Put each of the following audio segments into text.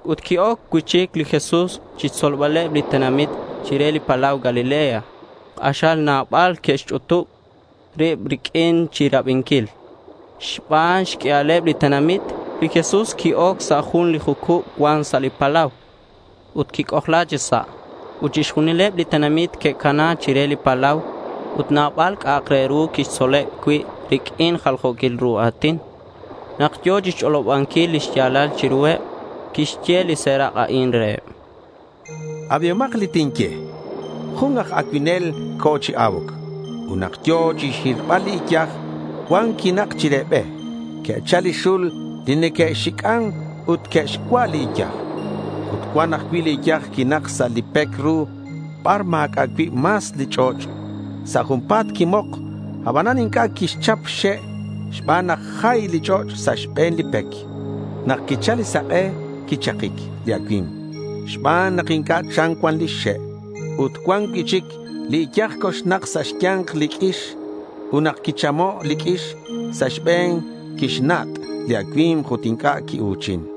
Ut qui-oc cui'chic li Jesús chixtzolbaleb li tenamit chire li palau Galilea. K'axal nabal que'xch'utub rib riq'uin chirabinquil. Xban xq'uialeb li tenamit, li Jesús qui-oc sa' jun li jucub cuan sa' li palau ut quic'ojla chi sa'. Ut chixjunileb li tenamit que'cana chire li palau. Ut nabal c'a'ak re ru quixtzoleb cui' riq'uin jaljo̱quil ru a̱tin. Nak yo̱ chixch'olobanquil li xya̱lal chiruheb, quixye li serak' a'in reheb: —Abihomak li tinye. Jun aj acuinel co̱ chi a̱uc. Ut nak yo̱ chixhirbal li iyaj, cuan quinak chire be. Que'chal li xul li neque'xic'an ut que'xcua' li iyaj. Ut cuan ajcui' li iyaj quinak sa' li pec ru bar ma̱c'a' cui' mas li ch'och'. Sa' junpa̱t quimok, abanan inc'a' quixchap xxe' xban nak jay li ch'och' sa' xbe̱n li pec. Nak quichal li sak'e quichakic li acui̱mk xban nak inc'a' cham cuan li xe'. Ut cuan cui'chic li iyaj coxnak sa' xya̱nk li q'uix. Ut nak quichamo' li q'uix sa' xbe̱n, quixnat' li acui̱mk ut inc'a' quiu̱chin.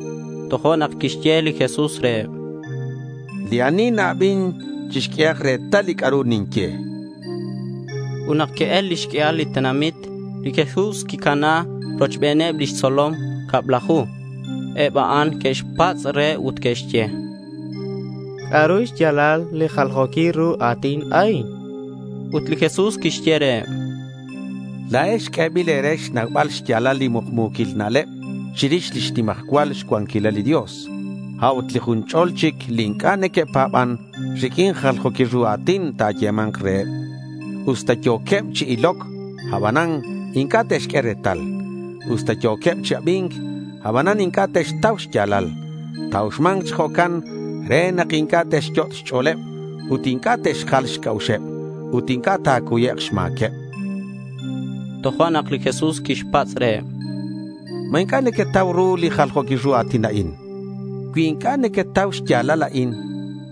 Tojo'nak quixye li Jesús reheb: —Li ani na-abin, chixq'uehak retal li c'a'ru ninye, chan. Ut nak que'el lix q'uial li tenamit, li Jesús quicana rochbeneb lix tzolom cablaju. Eb a'an que'xpatz' re ut que'xye: —¿C'a'ru xya̱lal li jaljo̱quil ru a̱tin a'in? chanqueb. Ut li Jesús quixye reheb: —La̱ex q'uebil e̱re xnaubal xya̱lal li mukmu̱quil na'leb chirix lix nimajcual xcuanquilal li Dios. A'ut li jun ch'o̱l chic li inc'a' neque'pa̱ban, riq'uin jaljo̱quil ru a̱tin ta̱yema̱nk reheb. Usta yo̱queb chi iloc, abanan inc'a' te'xq'ue retal. Usta yo̱queb chi abi̱nc, abanan inc'a' te'xtau xya̱lal. Ta̱uxma̱nk chi jo'can re nak inc'a' te'xyot' xch'o̱leb ut inc'a' te'xjal xc'a'uxeb ut inc'a' ta̱cuyek' xma̱queb.— Tojo'nak li Jesús quixpatz' reheb: —¿Ma inc'a' nequetau ru li jaljo̱quil ru a̱tin a'in? Cui inc'a' nequetau xya̱lal a'in,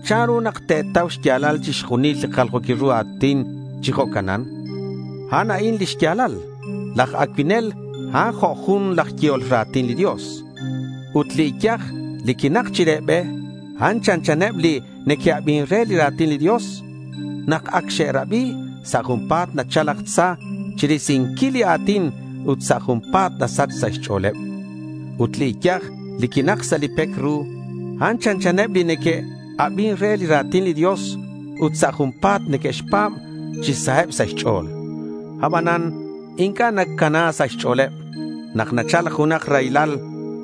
¿chanru nak te̱tau xya̱lal chixjunil li jaljo̱quil ru a̱tin chi jo'canan? A'an a'in lix ya̱lal. Laj acuinel a'an jo' jun laj yehol ra̱tin li Dios. Ut li iyaj li quinak chire be, a'an chanchaneb li neque'abin re li ra̱tin li Dios. Nak ac xe'rabi, sa' junpa̱t nachal laj Tza chirisinquil li a̱tin ut sa' junpa̱t nasach sa' xch'o̱leb. Ut li iyaj li quinak sa' li pec ru, a'an chanchaneb li neque'abin re li ra̱tin li Dios ut sa' junpa̱t neque'xpa̱b chi saheb sa' xch'o̱l. Abanan inc'a' nacana sa' xch'o̱leb. Nak nachal junak raylal,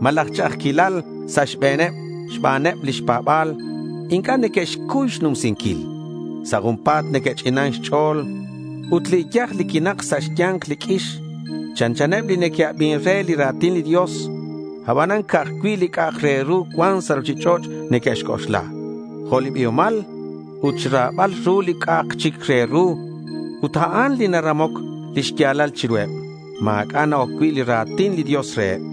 malaj ch'a'ajquilal sa' xbe̱neb xbaneb lix pa̱ba̱l, inc'a' neque'xcuy xnumsinquil. Sa' junpa̱t neque'ch'inan xch'o̱l. Ut li iyaj li quinak sa' xya̱nk li q'uix chanchaneb li neque'abin re li ra̱tin li Dios. Abanan ca'aj cui' li c'a'ak re ru cuan sa' ruchich'och' neque'xc'oxla, jo' li biomal ut xra̱bal ru li c'a'ak chic re ru. Ut a'an li naramoc lix ya̱lal chiruheb. Ma̱c'a' na-oc cui' li ra̱tin li Dios reheb.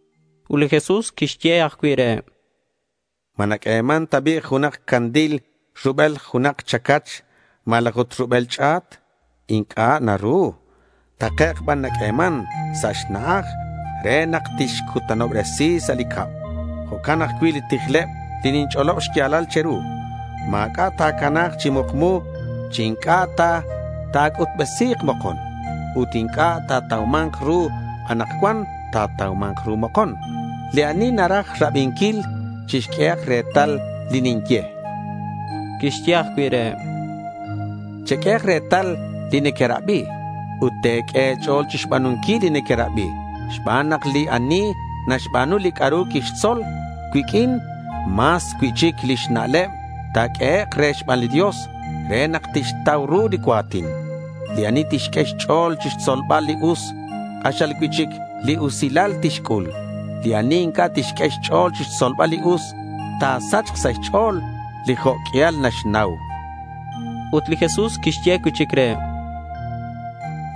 Ut li Jesús quixye ajcui' reheb: —¿Ma naq'ueman ta bi' junak candil rubel junak chacach malaj ut rubel ch'a̱t? Inc'a' naru. Takec' ban naq'ueman sa' xna'aj re nak tixcutanobresi sa' li cab. Jo'can ajcui' li tijleb li ninch'olob xya̱lal che̱ru. Ma̱c'a' ta̱cana̱k chi mukmu chi inc'a' ta ta̱c'utbesi̱k mokon. Ut li inc'a' natauman ru anakcuan, ta̱tauma̱nk ru mokon. Li ani naraj rabinquil, chixq'uehak retal li ninye. Quixye ajcui' reheb: —Cheq'uehak retal li nequerabi ut te̱q'ue e̱ch'o̱l chixba̱nunquil li nequerabi xban nak li ani naxba̱nu li c'a'ru quixtzol cuiq'uin, mas cui'chic lix na'leb ta̱q'uehek' re xban li Dios re nak tixtau ru li cua̱tin. Li ani tixq'ue xch'o̱l chixtzolbal li us, k'axal cui'chic li usilal tixc'ul. Li ani inc'a' tixq'ue xch'o̱l chixtzolbal li us, ta̱sachk sa' xch'o̱l li jo' q'uial naxnau. Ut li Jesús quixye cui'chic reheb: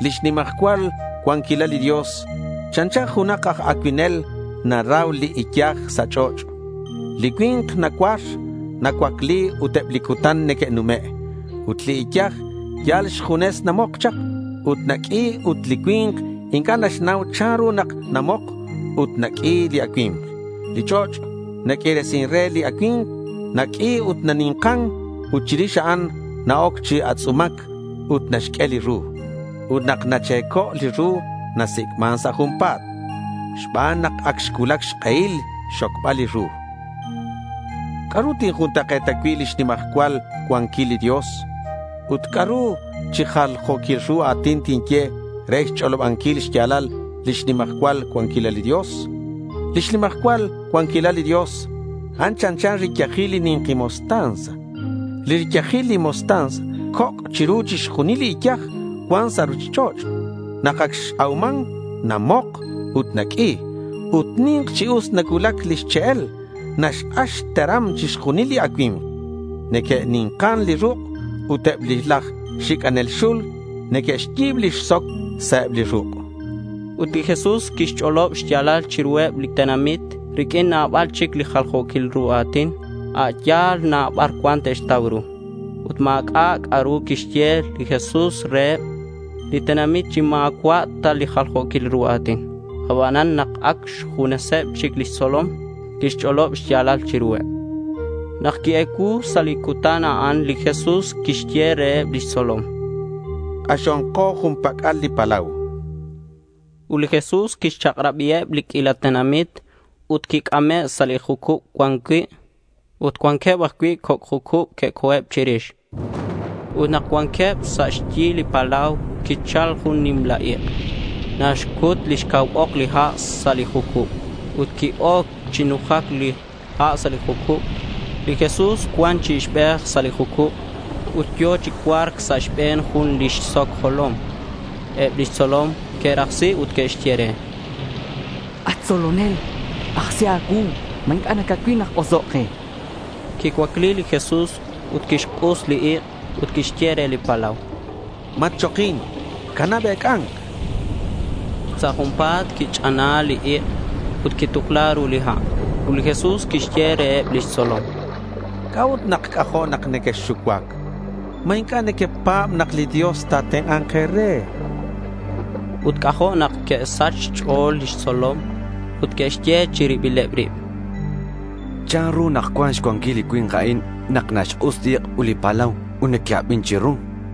—Lix nimajcual cuanquilal li Dios, chanchan junak aj acuinel. Narau li iyaj sa' ch'och'. Li cui̱nk nacuar, nacuacli ut eb li cutan neque'nume'. Ut li iyaj yal xjunes namok chak ut naq'ui ut li cui̱nk inc'a' naxnau chanru nak namok ut naq'ui li acui̱mk. Li ch'och' naq'uiresin re li acui̱mk. Naq'ui ut nani̱nkan ut chirix a'an na-oc chi atz'umac ut naxq'ue li ru. Ut nak nache̱co' li ru nasic'man sa' junpa̱t xban nak ac xcuulac xk'ehil xxocbal li ru. —¿C'a'ru tinjuntak'e̱ta cui' lix nimajcual cuanquil li Dios? chan li Jesús. —Ut ¿c'a'ru chi jaljo̱quil ru a̱tin tinye, re xch'olobanquil xya̱lal lix nimajcual cuanquilal li Dios? Lix nimajcual cuanquilal li Dios, a'an chanchan riyajil li ni̱nki mostaza. Li riyajil li mostaza coc' chiru chixjunil li iyaj cuan sa' ruchich'och'. Nak ac x-auman namok ut naq'ui. Ut ni̱nk chi us nacuulac lix che'el. Naxk'ax xteram chixjunil li acui̱mk. Neque'ni̱nkan li ruk' ut eb laj xic'anel xul neque'xyi̱b lix soc sa' eb li ruk'.— Ut li Jesús quixch'olob xya̱lal chiruheb li tenamit riq'uin nabal chic chi jaljo̱quil ru a̱tin a' ya̱l bar na cuan te'xtau ru. Ut ma̱c'a' c'a'ru quixye li Jesús reheb li tenamit chi ma̱cua' ta sa' jaljo̱quil ru a̱tin. Abanan nak ac xjuneseb chic lix tzolom, quixch'olob li xya̱lal chiruheb. Nak qui-ecuu sa' li cutan a'an li Jesús quixye reheb lix tzolom: —K'axonko jun pac'al li palau, chan reheb. Ut li Jesús quixchak'rabiheb li q'uila tenamit ut quic'ame' sa' li jucub cuan cui'. Ut cuanqueb ajcui' coc' jucub que'co̱eb chirix. Ut nak ac cuanqueb sa' xyi li palau quichal jun li nimla ik'. Naxcut lix cau ok li ha' sa' li jucub ut qui-oc chi nujac li ha' chi sa' li jucub. Li Jesús cuan chi ixbej sa' li jucub ut yo̱ chi cua̱rc sa' xbe̱n jun lix soc xjolom. Eb lix tzolom que'rajsi ut que'xye re: —At tzolonel, ajsi a̱cuu. ¿Ma inc'a' nacacuil nak osoc' ke? chanqueb. Quicuacli li Jesús ut quixk'us li ik' ut quixye re li palau: —Matchokin. Canab ec'a̱nc, chan. Ut sa' junpa̱t quich'ana li ik' ut quitukla ru li ha'. Ut li Jesús quixye reheb lix tzolom: —¿C'a'ut nak c'ajo' nak nequexxucuac? ¿Ma inc'a' nequepa̱b nak li Dios ta̱tenk'a̱nk e̱re? chan. Ut c'ajo' nak que'sach xch'o̱l lix tzolom ut que'xye chi rilbileb rib: —¿Chanru nak cuan xcuanquil li cui̱nk a'in nak naxk'us li ik' ut li palau, ut neque'abin chiru? chanqueb.